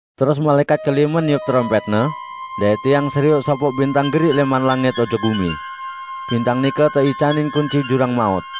Terus malaẽkat kelime niup terompẽtne, dait tiang serioq sopoq bintang geriq lẽman langit ojok gumi. Bintang nike teicanin kunci jurang maut.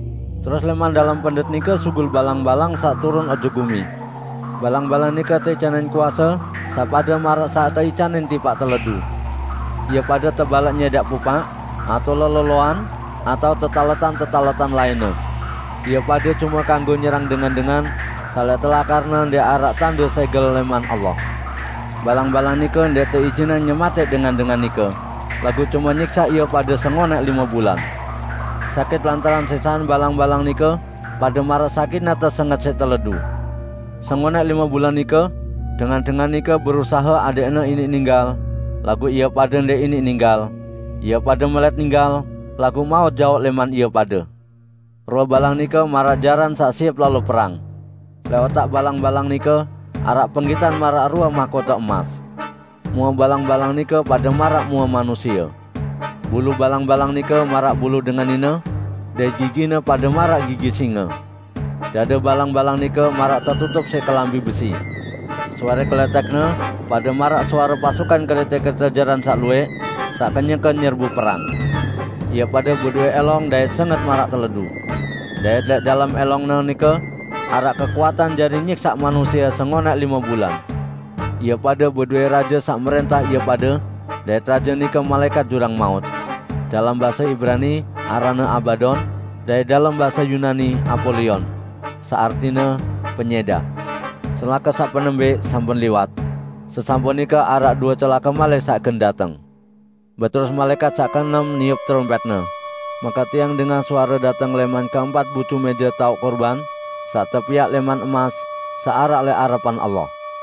Terus lẽman dalem pendet nike sugul balang-balang saq turun ojok gumi. Balang-balang nike teicanin kuase saq pade maraq saq teicanin tipaq teledu. Ie pade tebalaq nyẽdaq pupaq, atao leloloan, atao tetaletan-tetaletan lainne. Ie pade cume kanggo nyerang dengan-dengan saq lẽq telakarne ndẽq araq tande sẽgel lẽman Allah. Balang-balang nike ndẽq teijinang nyematẽq dengan-dengan nike, laguq cume nyiksaq ie pade sengonẽq lime bulan. Sakit lantaran siksaqan balang-balang nike pade maraq sakitne tesenget siq teledu. Sengonẽq lime bulan nike, dengan-dengan nike berusahe adẽqne iniq ninggal, laguq ie pade ndẽq iniq ninggal; ie pade melẽt ninggal, laguq maut jaoq lẽman ie pade. Rue balang nike maraq jaran saq siep lalo perang. Lẽq otak balang-balang nike araq penggitan maraq rue mahkote emas. Mue balang-balang nike pade maraq mue manusie. Bulu balang-balang nike maraq bulu dengan nine, dait gigine pade maraq gigi singe. Dade balang-balang nike maraq tetutup siq kelambi besi. Suare kelẽtẽkne pade maraq suare pasukan kerẽte-kerẽte jaran saq luwẽq saq kenyeke nyerbu perang. Ie pade bedowẽ ẽlong dait senget maraq teledu. Dait lẽq dalem ẽlongne nike araq kekuatan jari nyiksaq manusie sengonẽq lime bulan. Ie pade bedowẽ raje saq mrẽntah ie pade, dait raje nike malaẽkat jurang maut. Dalem base Ibrani aranne Abadon; dait dalem base Yunani Apolion (saq artine "Penyẽdaq"). Celake saq penembẽq sampun liwat. Sesampun nike araq due celake malik saq gen dateng. Beterus malaẽkat saq keenem niup terompẽtne. Make tiang dengah suare dateng lẽman keempat bucu mẽje taoq kurban saq tepiaq lẽman emas saq araq lẽq arepan Allah.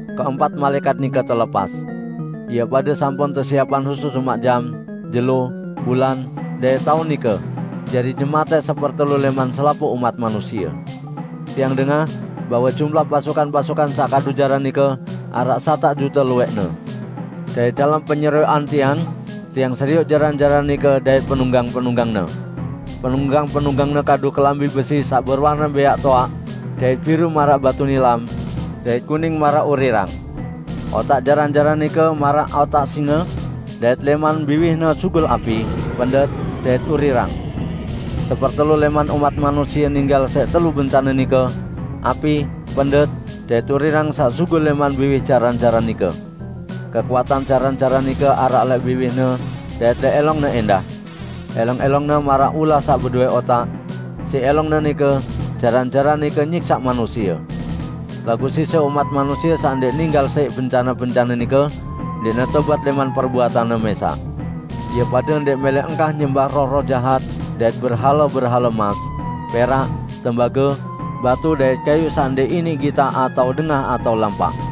Keempat malaẽkat nike telepas. Ie pade sampun tesiepang husus umaq jam, jelo, bulan, dait taun nike jari nyematẽq sepertelu lẽman selapuq umat manusie. Tiang dengah bahwe jumlah pasukan-pasukan saq kadu jaran nike araq satak jute luwẽqne. Dait dalem penyerioqan tiang, tiang serioq jaran-jaran nike dait penunggang-penunggangne. Penunggang-penunggangne kadu kelambi besi saq bewarne bẽaq toaq dait biru maraq batu nilam, dait kuning maraq urirang. Otak jaran-jaran nike maraq otak singe, dait lẽman biwihne sugul api, pendet, dait urirang. Sepertelu lẽman umat manusie ninggal siq telu bencane nike; api, pendet, dait urirang saq sugul lẽman biwih jaran-jaran nike. Kekuatan jaran-jaran nike araq lẽq biwihne dait lẽq ẽlongne ẽndah. ~Elong-ẽlongne maraq ulah saq bedowẽ otak. Siq ẽlongne nike, jaran-jaran nike nyiksaq manusie. Laguq sise umat manusie saq ndẽq ninggal siq bencane-bencane nike ndẽqne tobat lẽman perbuatanne mẽsaq. Ie pade ndẽq mẽlẽ engkah nyembah roh-roh jahat dait berhale-berhale emas, perak, tembage, batu dait kayuq saq ndẽq iniq gitaq atao dengah atao lampaq.